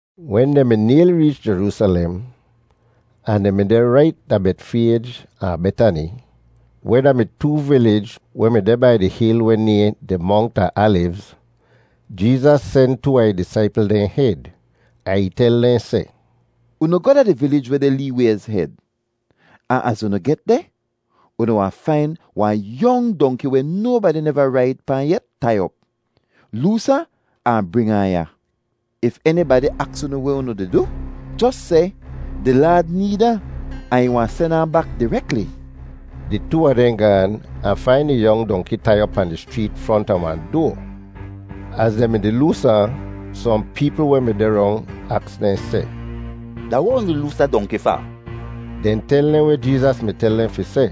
Wen dehn mi nayli reech Jeroosalem, ahn dehn mi deh rait da Betfayj ahn Betani, weh da-mi too vilij weh mi deh bai di hil weh nayhn di Mongt a Alivz, Jeezas sen too a ih disaipl dehn hed, ahn ih tel dehn seh, “Unu goh da di vilij weh deh lee wayz hed, ahn az unu get deh, unu wahn fain wahn yong dongki weh nobadi neva raid pahn yet tai op. Loos ahn, ahn bring ahn ya. If enibadi aks unu weh unu di du, jos seh, ‘Di Laad need ahn, ahn ih wahn sen ahn bak direkli.’” Di too a dehn gaan ahn fain di yong dongki tai op pahn di schreet fronta wahn doa. Az dehn mi-di loos ahn, sohn peepl weh mi deh rong aks dehn seh, “Da weh unu di loos da dongki fa?” Dehn tel dehn weh Jeezas mi tel dehn fi seh,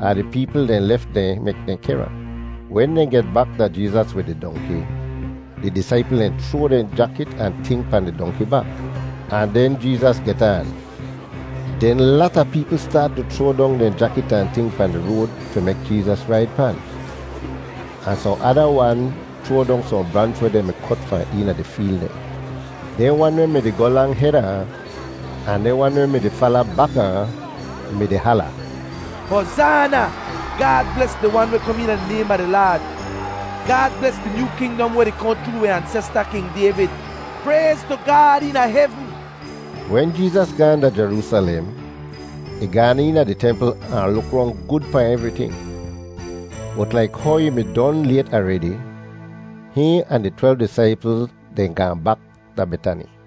ahn di peepl dehn lef dehn mek dehn kehr ahn. Wen dehn get bak da Jeezas wid di dongki, di disaipl dehn chroa dehn jakit ahn ting pahn di dongki bak, ahn den Jeezas get aan. Den lata peepl staat tu chroa dong dehn jakit ahn ting pahn di road fi mek Jeezas raid pan, ahn sohn ada wan chroa dong sohn branch weh dehn mi kot fahn eena di feel dehn. Dehn wan weh mi-di goh lang heda ahn, ahn dehn wan weh mi-di fala baka ahn mi-di hala, “Hozaana! Gaad bles di Wan weh kom eena di naym a di Laad! Gaad bles di nyoo kingdom weh di kohn chroo wi ansesta, King Dayvid! Prayz tu Gaad eena hevn!” Wen Jeezas gaahn da Jeroosalem, ih gaan eena di templ ahn luk rong gud pahn evriting, bot laik how ih mi don layt aredi, hihn ahn di twelv disaipl dehn gaahn bak da Betani.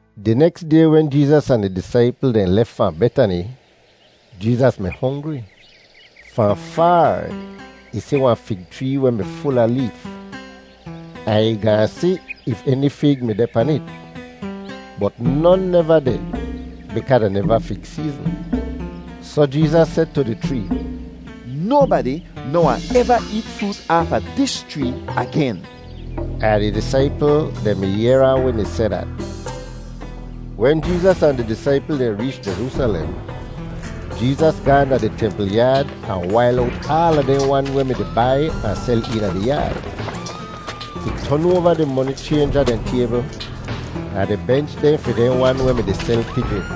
Di neks day wen Jeezas ahn ih disaipl dehn lef fahn Betani, Jeezas mi hongri. Fahn faar ih si wahn fig chree weh mi ful a leef, ahn ih gaahn si if eni fig mi deh pan it. Bot non neva deh bikaa da neva fig seezn. Soh Jeezas seh tu di chree, “Nobadi noh wahn eva eet froot aafa dis chree agen!” Ahn di disaipl dehn mi yehr ahn wen ih seh dat. Wen Jeezas ahn di disaipl dehn reech Jeroosalem, Jeezas gaahn da di templ yaad ahn wail owt aala dehn wan weh mi-di bai ahn sel eena di yaad. Ih ton oava di moni chaynja dehn taybl ahn di bench dehn fi dehn wan weh mi-di sel pijin.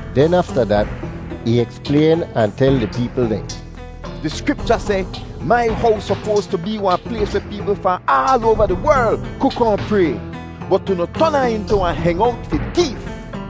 Den afta dat ih eksplayn ahn tel di peepl dehn, “Di Skripcha seh, ‘Mai hows sopoas tu bee wahn plays weh peepl fahn aal oava di werl ku kohn pray.’ Bot unu ton ahn intu ‘wahn hengowt fi teef.’”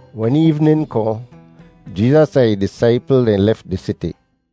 Wen eevnin kohn, Jeezas ahn ih disaipl dehn lef di siti.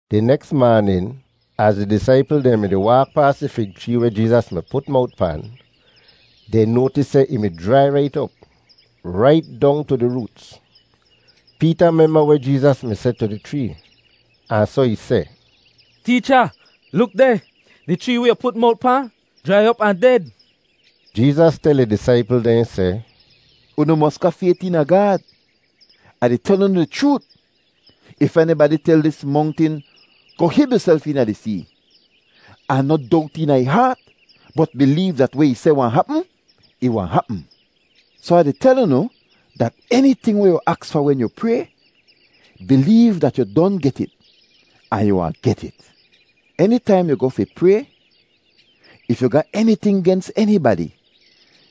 Di neks maanin, az di disaipl dehn mi-di waak paas di fig chree weh Jeezas mi put mowt pan, dehn noatis seh ih mi jrai rait op, rait dong tu di roots. Peeta memba weh Jeezas mi seh tu di chree, ahn soh ih seh, “Teecha, luk deh! Di chree weh yu put mowt pahn jrai op ahn ded.” Jeezas tel ih disaipl dehn seh, “Unu mos ga fayt eena Gaad. Ah di tel unu di chroot, if enibadi tel dis mongtin, ‘Goh hib yuself eena di see,’ ahn noh dowt eena ih haat, bot bileev dat weh ih seh wahn hapm, ih wahn hapm. Soh Ah di tel unu dat eniting weh yu aks fa wen yu pray, bileev dat yu don get it, ahn yu wahn get it. Enitaihn yu goh fi pray, if yu ga eniting gens enibadi,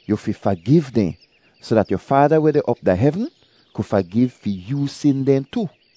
yu fi fagiv dehn soh dat yu Faada weh deh op da hevn ku fagiv fi yoo sin dehn tu.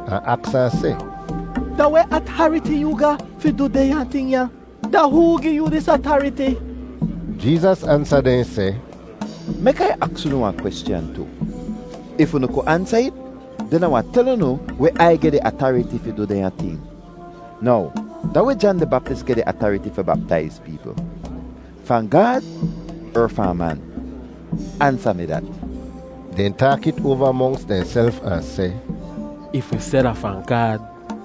ahn aks ahn seh, “Da weh atariti yoo ga fi du dehnya ting ya? Da hoo gi yoo dis atariti?” Jeezas ansa dehn seh, “Mek Ai aks unu wahn kweschan tu. If unu ku ansa it, den Ah wahn tel unu weh Ai geh di atariti fi du dehnya ting. Now, da weh Jan di Baptis geh di atariti fi baptaiz peepl—fahn Gaad er fahn man? Ansa mi dat!” Dehn taak it oava monks dehnself ahn seh, “If wi seh da fahn Gaad,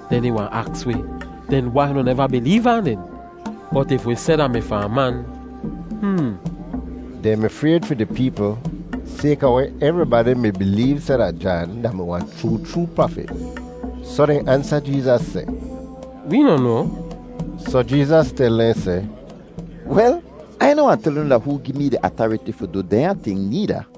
den ih wahn aks wi, ‘Den wai unu neva bileev ahn den?’ Bot if wi seh da mi fahn man...hmm!” (Dehn mi frayd fi di peepl sayka weh evribadi mi bileev seh dat Jan da-mi wahn chroo chroo prafit.) Soh dehn ansa Jeezas seh, “Wee noh noa.” Soh Jeezas tel dehn seh, “Wel, Ai noh wahn tel unu da hoo gi mee di atariti fi du dehnya ting needa.”